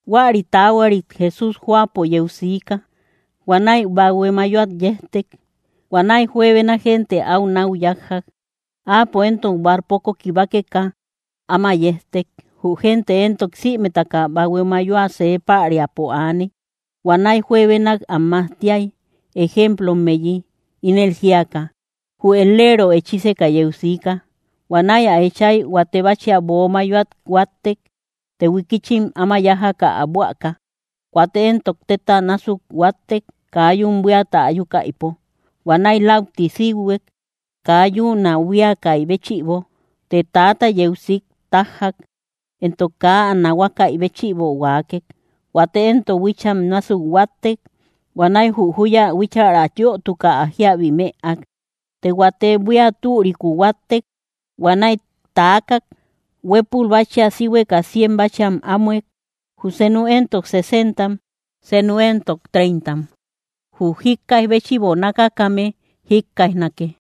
Huäri taahuarit Jesús jóapo yeu siika. Huanäi bahue mayoat yejtek. Huanäi juebena gente áu náu yájjak. Áapo éntok barcopo kibakeka, áma yejtek. Jü gente éntok sïmetaka bahue mayoa see päriapo aaney. Huanäi juebenak am majtiak, ejemplommeyi ínel jíaka: —Jü et‑leero echíseka yeu siika. Huanäi ä echay, huate báchia böo mayoat huáttek. Të huikichim áma yájaka ä buäka. Huate éntok tétam násuk huáttek, kaa yún buíata ayukaïpo. Huanäi läuti síuhuek, kaa yún ä buíakaï béchïbo. Të täata yeu sik tájjak, entok kaa ä nahuakaï béchïbo huaakek. Huate éntok huícham násuk huáttek. Huanäi jü júya huíchära yötuka, ä jíabi mëak. Të huate buía türikuu huáttek. Huanäi taakak; huépul báchia síhueka cien báchiam ámuek; jü senu éntok sesentam; senu éntok treintam. ¡Jü jíkkaij béchïbo nákakame jikkaijnake!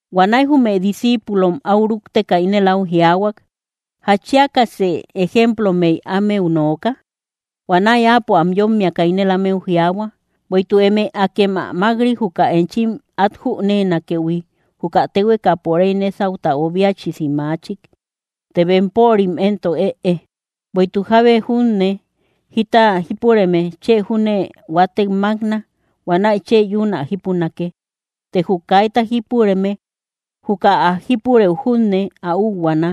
Huanäi jume discíipulom áu rúkteka, ínel áu jiaahuak: —¿Jatchiakasë ejemplommey ámeu nooka? Huanäi Áapo am yómmiaka ínel ámeu jiaahua: —Bueïtuk eme akem ä mák‑ri, juka enchim át jüneenakëhui, juka téhuekapo réy nésauta obiachisi maachik. Të bempörim éntok, ëe. Bueïtuk jábe junne jita jípureme, chë júne huatek mákna; huanäi chë yún ä jípunake. Të jü kaita jípureme, juka ä jípurëu junne ä úuhuaana.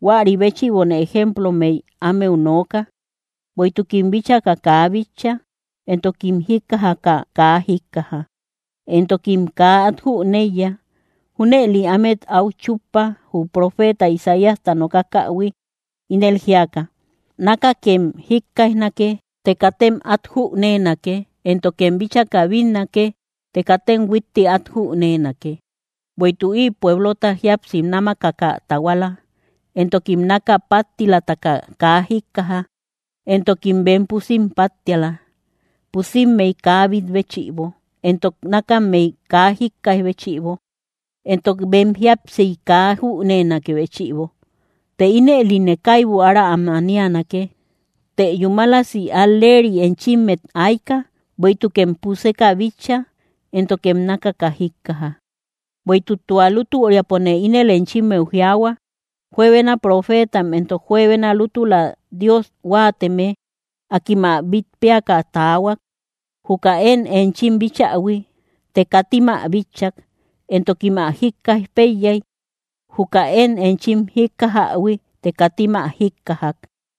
Huäri béchïbone ejemplommey ámeu nooka; bueïtukim bíchaka kaa bitcha, entokim jíkkajaka kaa jíkkaja, entokim kaa át jüneiya. Júnëli ámet áu chúppa, jü profeeta Isaíasta nokakähui, ínel jíaka: Nákakem jíkkaijnake, të katem át jüneenake; éntokem bíchaka bínnake, të katem huitti át jüneenake. Bueïtuk ï pueblota jíapsi námakaka tahuala; entokim náka páttilataka kaa jíkkaja; entokim bem pusim páttiala, pusimmey kaa bít béchïbo, entok nákammey kaa jíkkaij béchïbo, entok bem jíapsiy kaa am jüneenakë béchïbo. Të ínëline kaibu ára am anianake. ’Të yúmalasi al‑leeri enchimmet ayka; bueïtukem puseka bitcha, éntokem nákaka jíkkaja. Bueïtuk tua lútüriapone ínel enchimmeu jiaahua, juebena profeetam entok juebena lútula Dios huáateme, akim ä bít péaka taahuak, juka én enchim bíchähui; të katim ä bitchak. Entokim ä jíkkaij péiyay, juka én enchim jíkkajähui, të katim ä jíkkajak.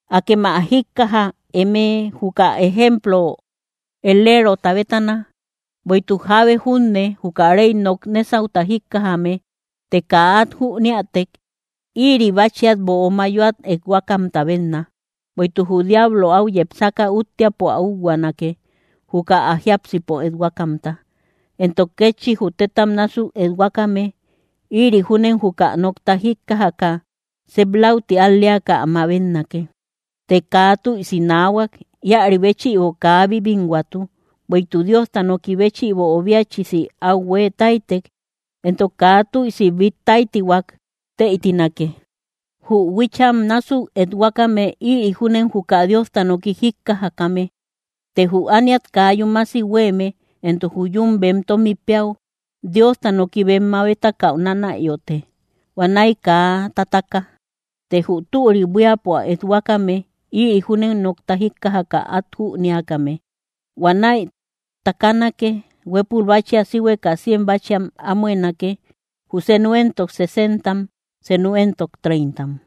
’Akem ä jíkkaja eme, juka ejemplo et‑leerota bétana. Bueïtuk jábe junne, juka réy nok nésauta jíkkajame, të kaa at jüniätek, íri báchiat böo mayoat ethuakamta bénna; bueïtuk jü diablo áu yepsaka, úttiapo ä úuhuanake, juka ä jiápsipo ethuakamta. Entok kétchi jü tétam násuk ethuakame, ïri júnen juka nokta jíkkajaka, sep läuti al‑leaka ä mabetnake. Të kaa tüisi naahuak; íäri béchïbo kaa bíbinhuatu; bueïtuk Diosta noki béchïbo obiachisi áu huée táytek entok kaa tüisi bít táytihuak, tëitinake. Jü huícham násuk ethuakame, ïri júnen juka Diosta noki jíkkajakame; të jü ániat kaa yúmasi huéeme, entok jü yún bem tómi péäu, Diosta noki bem mabetakäu nánayote. Huanäi kaa tataka. Të jü türi buíapo ethuakame, ïri júnen nokta jíkkajaka át jünéakame. Huanäi takanake. Huépul báchia síhueka cien báchiam ámuenake; jü senu éntok sesentam; senu éntok treintam.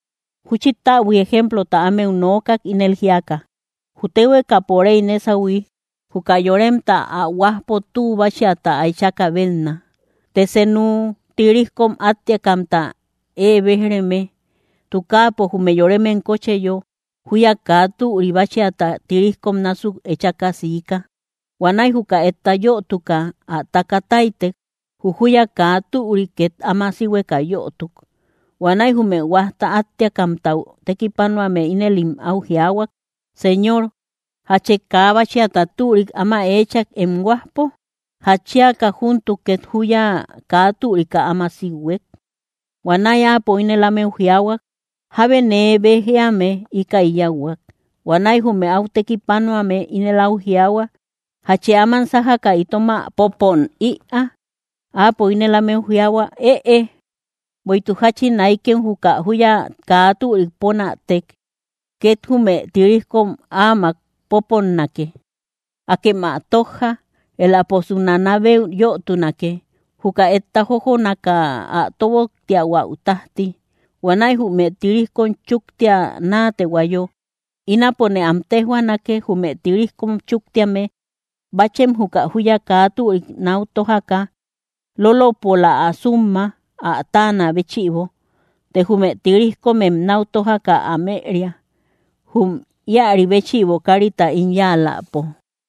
Júchi täbui ejemplota ámeu nookak, ínel jíaka: —Jü téhuekapo réy nésahui, juka yoremta ä huajpo tü báchiata ä echakä bénna. Të seenu, tirijkom áttiakamta ée béj‑reme, tukaapo jume yoremem kócheyo, júya kaa türi báchiata tirijkom násuk echaka siika. Huanäi juka etta yötuka ä taka táytek, jü júya kaa türi két áma síhueka yötuk. Huanäi jume huajta áttiakamtau tekipanuame ínëlim áu jiaahuak: “Señor, ¿jache kaa báchiata türik áma eechak, em huajpo? ¿Játchiaka júntuk ket júya kaa türika áma síuhuek?” Huanäi áapo ínel ámeu jiaahuak: “Jábe nee béj éame íkäi yáuhuak.” Huanäi jume áu tekipanuame ínel áu jiaahua: “¿Jachë áman sájaka itom ä popón ïaa?” Áapo ínel ámeu jiaahuak: “Ëe, bueïtuk jáchin aykem juka júya kaa türik pónätek, két jume tirijkom áamak popónnake. Akem ä tójja; éläposu nánabeu yötunake, juka etta jójonaka ä tóboktiahuäu tájti. Huanäi jume tirijkom chúktia naatehuayo, ínapone am téjhuaanake, jume tirijkom chúktíame, báchem juka júyata kaa türik náu tójaka, lólopola ä súmma, ä táanä béchïbo; të jume tirijkomem náu tójaka am ëeria, jum íäri béchïbo kárita ín yáaläpo.”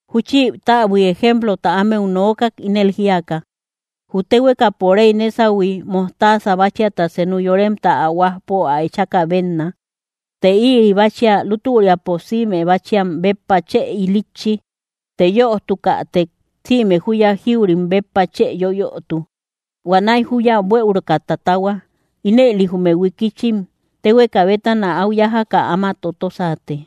Júchi täbuik ejemplota ámeu nookak, ínel jíaka: —Jü téhuekapo réy nésahui, mojtaasa báchiata senu yoremta ä huajpo ä echakä bénna. Të ïri báchia lútüriapo sïme báchiam béppa chë ilitchi; të yötukätek sïme júya jíurim béppa chë yoyötu. Huanäi júya buëuruka tatahua. Ínëli jume huikichim téhueka bétana áu yájaka áma totosate.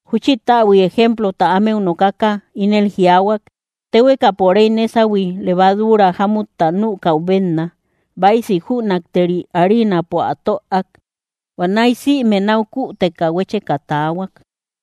Júchi täbuik ejemplota ámeu nokaka, ínel jiaahuak: —Téhuekapo réy nésahui, levaduura jámutta nükäu bénna, báisi jünakteri ariinampo ä töak. Huanäi sïme náu küteka huécheka taahuak.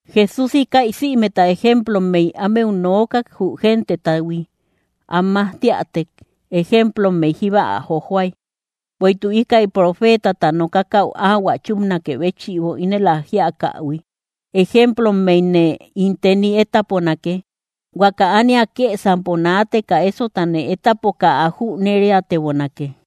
Jesús íkäi sïmeta ejemplommey ámeu nookak, jü gentetahui. Am majtiätek, ejemplommey jíba ä jojoay, bueïtuk íkäi profeetata nokakäu áhuä chúpanakë béchïbo, ínel ä jíakähui: Ejemplommeyne ín teni étaponake, huaka ániata kësampo naateka ésotane étapoka ä jüneriatebonake.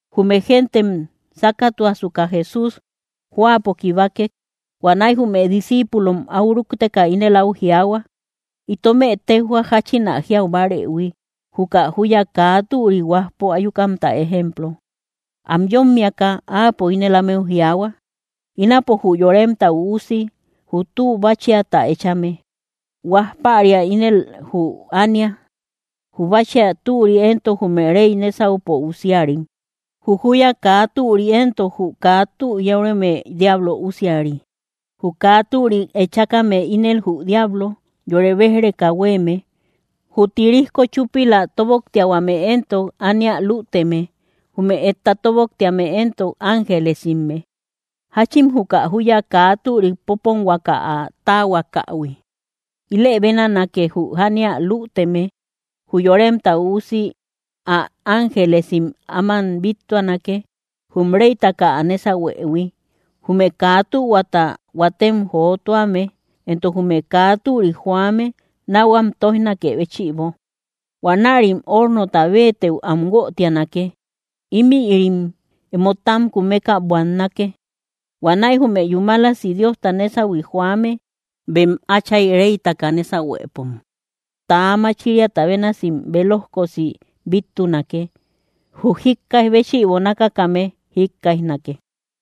Jume gentem sákatuasuka, Jesús jóapo kibakek. Huanäi jume discíipulom áu rúkteka, ínel áu jiaahua: —Itomë téjhua jáchin ä jiau bárëhui, juka júya kaa türi huajpo ayukamta ejemplo. Am yómmiaka Áapo ínel ámeu jiaahua: —Ínapo jü Yoremta Üusi jü tü báchiata echame. Huaj päria ínel jü ánia; jü báchia türi éntok, jume réy nésaupo usiarim; jü júya kaa türi éntok jü kaa tü yóreme diablo usiari. Jü kaa türik echákame ínel jü diablo yore béj‑reka huéeme; jü tirijko chúpila tóboktiahuame éntok ánia lüteme; jume etta tóboktéame éntok ángelesimme. Jáchin juka júya kaa türik popónhuaka ä táahuakahui, ilë bénanake, jü ánia lüteme. Jü Yoremta Üusi ä ángelesim áman bíttuanake, jum réytaka ä nésahuëhui, jume kaa tühuata huatem jotuame entok jume kaa türik joame náu am tóijnakë béchïbo. Huanärim ornota béetëu am guötianake. Ímïrim emo tam kumeka buannake. Huanäi jume yúmalasi Diosta nésahui joame, bem Áchay réytaka nésahuepom täa machiriata bénasim bélojkosi bíttunake. ¡Jü jíkkaij béchïbo nákakame jíkkaijnake!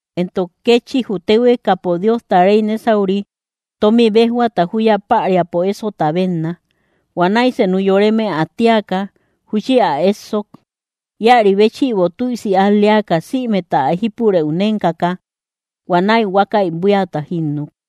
’Entok kétchi jü téhuekapo Diosta réy nésauri tómi béjhuata júya päriapo ésota bénna. Huanäi senu yoreme ä tíaka, júchi ä éssok. Íäri béchïbo tüisi al‑leaka sïmeta ä jípurëu nénkaka, huanäi huákäi buíata jínnuk.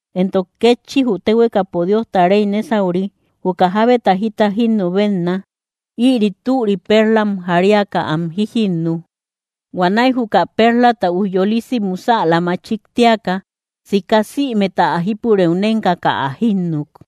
’Entok kétchi jü téhuekapo Diosta réy nésauri juka jábeta jita jinnü bénna. Ïri türi perlam jariaka am jíjinnu. Huanäi juka perlata ujyolisi musäla machik téaka, sika sïmeta ä jípurëu nénkaka, ä jínnuk.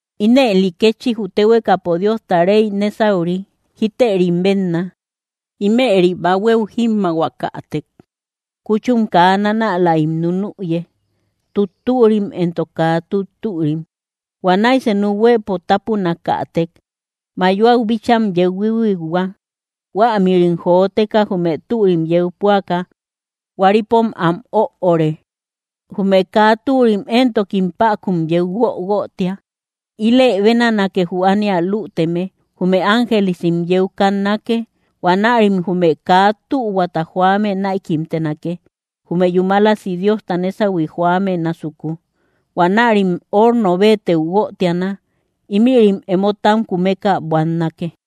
’Ínëli kétchi jü téhuekapo Diosta réy nésauri jítërim bénna. Ímëri bahuéu jímmahuakätek, kúchum kaa nánälaim nunüye, tuttürim entok kaa tuttürim. Huanäi senu huëpo tápunakätek, mayoau bícham yeu huíhuikhua. Huämïrim joteka jume türim yeu püaka, huaripom am öore; jume kaa türim éntokim päkun yeu guöguötia. Ilë bénanake jü ánia lüteme: jume ángelesim yeu kannake; huanärim jume kaa tühuata joame näikimtenake, jume yúmalasi Diosta nésahui joame násuku. Huanärim horno béetëu guötiana; ímïrim emo tam kumeka buannake.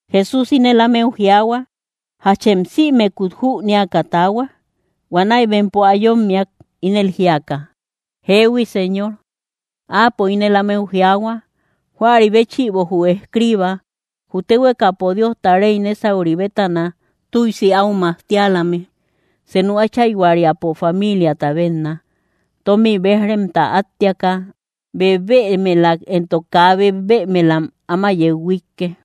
Jesús ínel ámeu jiaahua: —¿Jachem sïmekut jüniaka taahua? Huanäi bempo ä yómmiak, ínel jíaka: —Jeehui, Señor. Áapo ínel ámeu jiaahua: —Huäri béchïbo jü escriiba jü téhuekapo Diosta réy nésauri bétana tüisi áu majtialame, senu áchayhuariapo famiiliata bénna. Tómi béj‑remta áttiaka, bebëmelak entok kaa bebëmelak áma yeu huíike.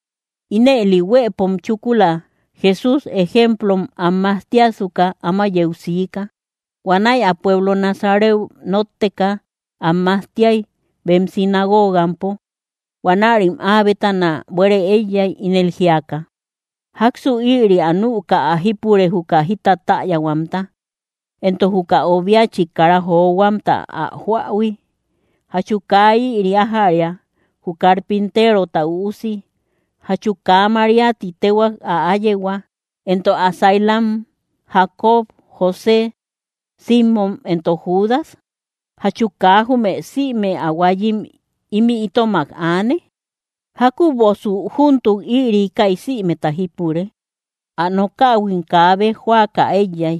Ínëli huëpo chúkula, Jesús ejemplom am majtiasuka, áma yeu siika. Huanäi ä pueblo Nazareu notteka, am majtiay bem sinagogampo. Huanärim áa bétana buére éiyay, ínel jíaka: —¿Jáksu ïri ä nüka ä jípure, juka jita täyahuamta? Entok, ¿juka obiachik kara johuamta ä joähui? ¿Jachu kaa ïri ájäria, jü carpinterota üusi? ¿Jachu kaa María ti téhuak, ä áyehua; entok ä sailam, Jacobo, José, Simmom entok Judas? ¿Jachu kaa jume sïme ä huayim ímï itomak aane? ¿Jákübosu júntuk ïri íkäi sïmeta jípure? Ä nokähuim kaa béj jóaka éiyay.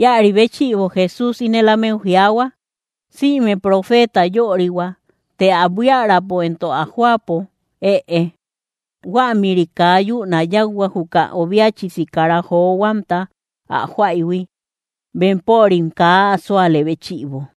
Íäri béchïbo Jesús ínel ámeu jiaahua: —Sïme profeeta yörihua; të ä buiärapo entok ä jóapo, ëe. Huämïri kaa yún ä yáuhuak, juka obiachisi kara johuamta ä joaïhui, bempörim kaa ä súale béchïbo.